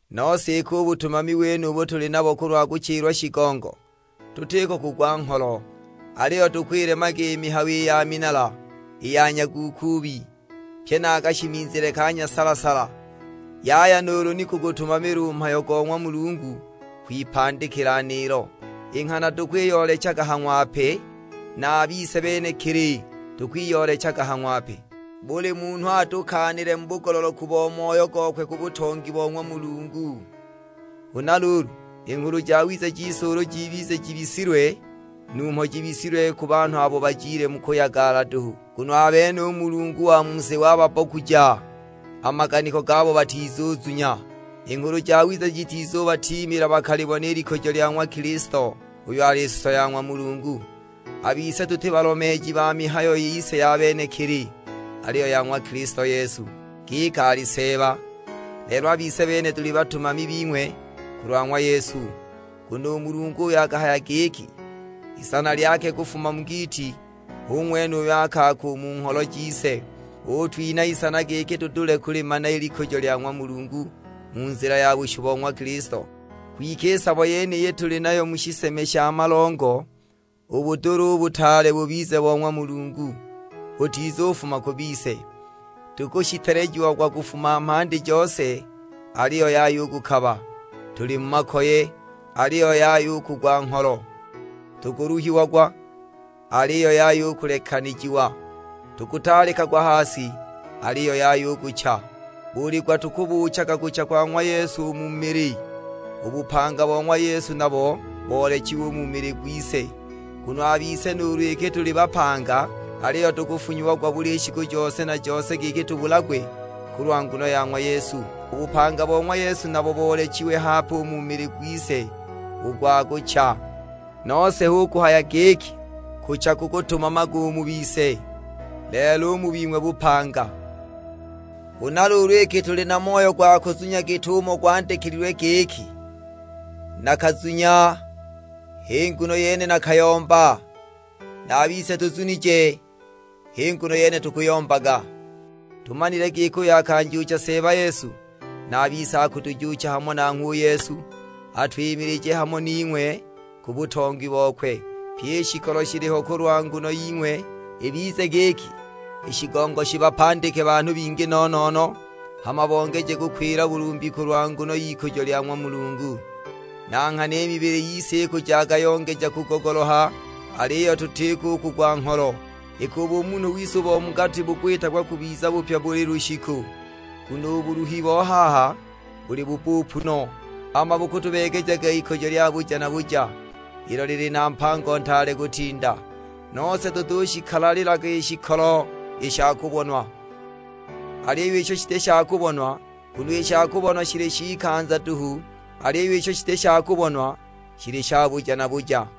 Nose iki u butumami wenubu tuli nabo kulwa kuchilwa shigongo, tutiko kugwa ngholo. Aliyo tukwilemaga i mihayo ya minala, i ya nyaguukuubi; pye na a kashimizile ka nyasala-sala. Yaya nuulu ni kugutumamila u mhayo go ng'wa Mulungu kwipandikila niilo. I nghana tukwiyoolechaga ha ng'wape, na a bise benekili tukwiyoolechaga ha ng'wape, buli munhu atukaanile mu bugololoku bo moyo gokwe ku butongi bo ng'wa Mulungu. Huna luulu, i Nghulu Jawiza jise ulu jibize jibisilwe, numho jibisilwe ku banhu abo bajile mu kuyagala duhu. Nguno a bene u mulungu wa mu si wagabbokuja a maganiko gabo batizuzunya; i Nghulu Jawiza jitizubatiimila bakalibona i likujo lya ng'wa Kilisto, uyo ali suso ya ng'wa Mulungu. A bise tuti balomeeji ba mihayo yise ya benekili, aliyo ya ng'wa Kilisto Yesu, giki ali Seeba; lelo a bise bene tuli batumami bing'we kulwa ng'wa Yesu. Nguno u Mulungu uyo akahaya giki, "Isana lyake kufuma mu giiti," hu ng'wene uyo akaaka u mu ngholo jise, utwinha isana giki tudule kulimana i likujo lya ng'wa Mulungu mu nzila ya bushu bo ng'wa Kilisto. Kwike i sabo yeniyi tuli nayo mu shiseme sha malongo, u budula u butaale bubize bo ng'wa Mulungu, butizufuma ku bise. Tukushitelejiagwa kufuma mhandi jose, aliyo yaya u kukaba; tuli mu makoye, aliyo yaya u kugwa ngholo. Tukuluhiagwa, aliyo yaya u kulekanijiwa; tukutaalikagwa ha si, aliyo yaya u kucha. Buli gwa tukubuuchaga kucha kwa ng'wa Yesu u mu mili, u bupanga bo ng'wa Yesu nabo boolechiwe u mu mili gwise. Nguno a bise nuulu iki tuli bapanga, aliyo tukufunyiagwa buli shiku jose na jose giki tubulagwe kulwa nguno ya ng'wa Yesu; u bupanga bo ng'wa Yesu nabo boolechiwe hape u mu mili gwise u gwa kucha. Nose hu kuhaya giki, kucha kukutumamaga u mu bise, lelo u mu bing'we bupanga. Huna luulu iki tuli na moyo gwa kuzunya git'umo gwandikilwe giki, "Nakazunya h'i nguno yene nakayomba;" na a bise tuzunije, h'i nguno yene tukuyombaga. Tumanile giki uyo akanjuucha Seeba Yesu na a bise akutujuucha hamo nanhgwe u Yesu, atwimilije hamo ning'we ku butongi bokwe. Pyi i shikolo shiliho kulwa nguno ying'we, ibize giki i shigongo shibapandike banhu bingi no-no-no, hama bongeje kukwila bulumbi kulwa nguno y'ikujo lya ng'wa Mulungu. Na nghana i mibili yise ikujaga yongeja kugogoloha, aliyo tutiko u kugwa ngholo, iki u bumunhu wise u bo mu gati bukwitagwa kubiza bupya buli lushiku. Nguno u buluhi bo haha buli bubbupu no, hama bukutubeegejaga ikujo lya buja na buja, ilo lili na mpango ntaale kutinda. Nose tutushikalalilaga i shikolo i sha kubonwa, aliyo isho shiti sha kubonwa. Nguno i sha kubonwa shili sh'ikanza duhu, aliyo isho shiti sha kubonwa shili sha buja na buja.